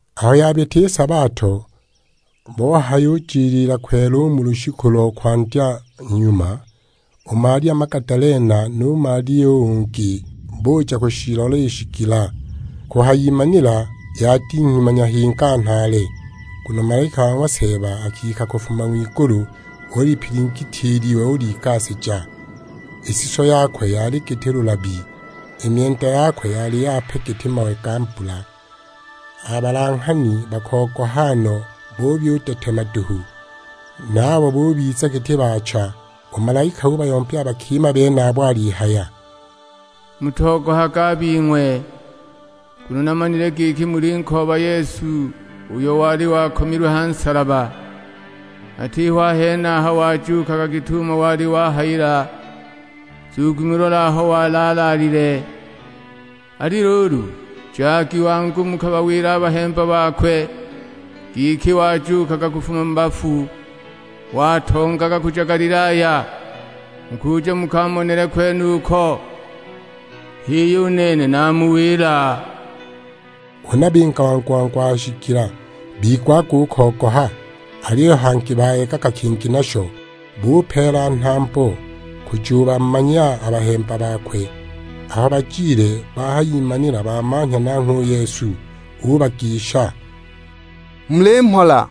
Aho yabita i sabato, bohayujiliila kwela u mu lushiku lo kwandya nyuma, u Malia Magadalena nu Malia u ungi, buja kushilola i shigila. Kuhayimanila yadinghima nyahinga nhaale, nguno malaika wa ng'wa Seeba akika kufuma ng'wigulu; ulipilingitya i liwe uligasija. I suso yakwe yali giti lulabi, i myenda yakwe yali yape giti mawe ga mbula. A balanghani bakogoha no, buyudetema duhu, naabo bubiza giti baacha! U malaika ubayombya a bakima benabo alihaya, "Mutogohage a bing'we, nguno namanile giki mulinkooba Yesu uyo wali wakomilwe ha nsalaba. Atiho a henaha wajuukaga git'umo wali wahayila; nzugi mulole aho wali alaalile! Ali luulu, jagi wangu mukabawile a bahemba bakwe, giki wajuukaga kufuma mu bafu; watongaga kuja Galilaya, mukuja mukamonele kwenuko. H'iyo, u nene namuwila." Huna binga wangu-wangu a ha shigila, bigwaga u kogoha, aliyo hangi bayegaga kingi nasho; bupeela nhambo kujubamanya a bahemba bakwe. Aho bajile, bahayimanila bamanhya nanghwe u Yesu; ubagisha, "Muli mhola!"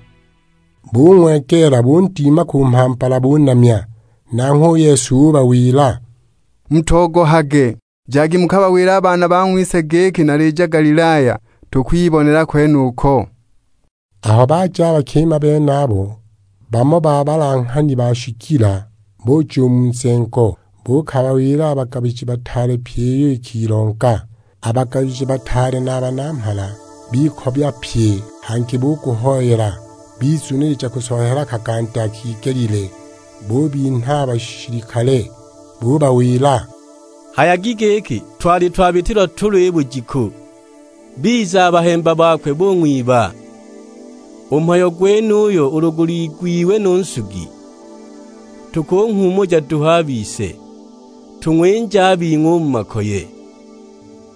Bung'wegeela, bundima ku mhambala bunamya. Nanghwe u Yesu ubawila, "Mutogohage, jagi mukabawile a baana bang'wise giki nalija Galilaya, tukwibonela kwenuko." Aho baja a bakima benabo, bamo ba balanghani ba shigila buja u mu nzengo, buukabawila a bagabiji bataale pyi iyo ikilonga. A bagabiji bataale na a banamhala bikobya pye hangi buguhoyela, bizunilija kusola hela kaganda kigelile; bubinha a bashilikale. Bubawila; "Hayagi giki, 'Twali twabitilwa tulo i bujiku, biza a bahemba bakwe bung'wiba!' U mhayo gwenuyu ulu guliigwiwe nu nsugi, tukunghuumuja duhu a bise, tung'winje a bing'we u mu makoye."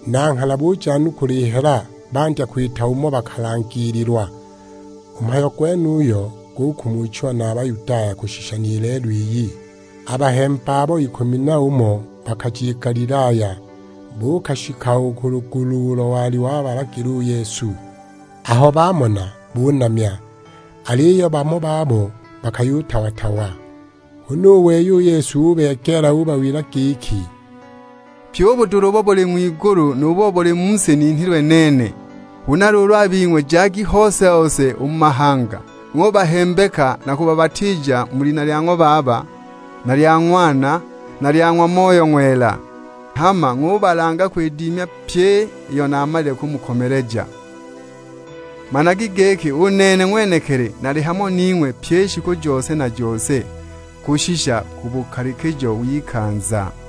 Na nghana bujanukula i hela, bandya kwita umo bakalangiililwa. U mhayo gwenuyo gukumuchiwa na a Bayudaya kushisha ni lelo iyi. A bahemba abo ikumi n'umo bakaja i Galilaya, buukashika u ku lugulu ulo wali wabalagila u Yesu. Aho bamona bunamya, aliyo bamo babo bakayutawa-tawa. Huna u wei u Yesu ubegeela ubawila giki, "Pyi u budula ubo buli ng'wigulu nu bo mu si ninhilwe nene. Huna luulu a bing'we jagi hose-hose u mu mahanga; ng'ubahembeka na kubabatiija mu lina lya ng'wa Baba, na lya Ng'wana, na lya ng'wa Moyo Ng'wela. Hama ng'ubalanga kwidima pyi iyo naamalile kumukomeleja, managi giki u nene ng'wenekili nali hamo ning'we pyi i shiku jose na jose, kushisha ku bukalikijo w'ikanza."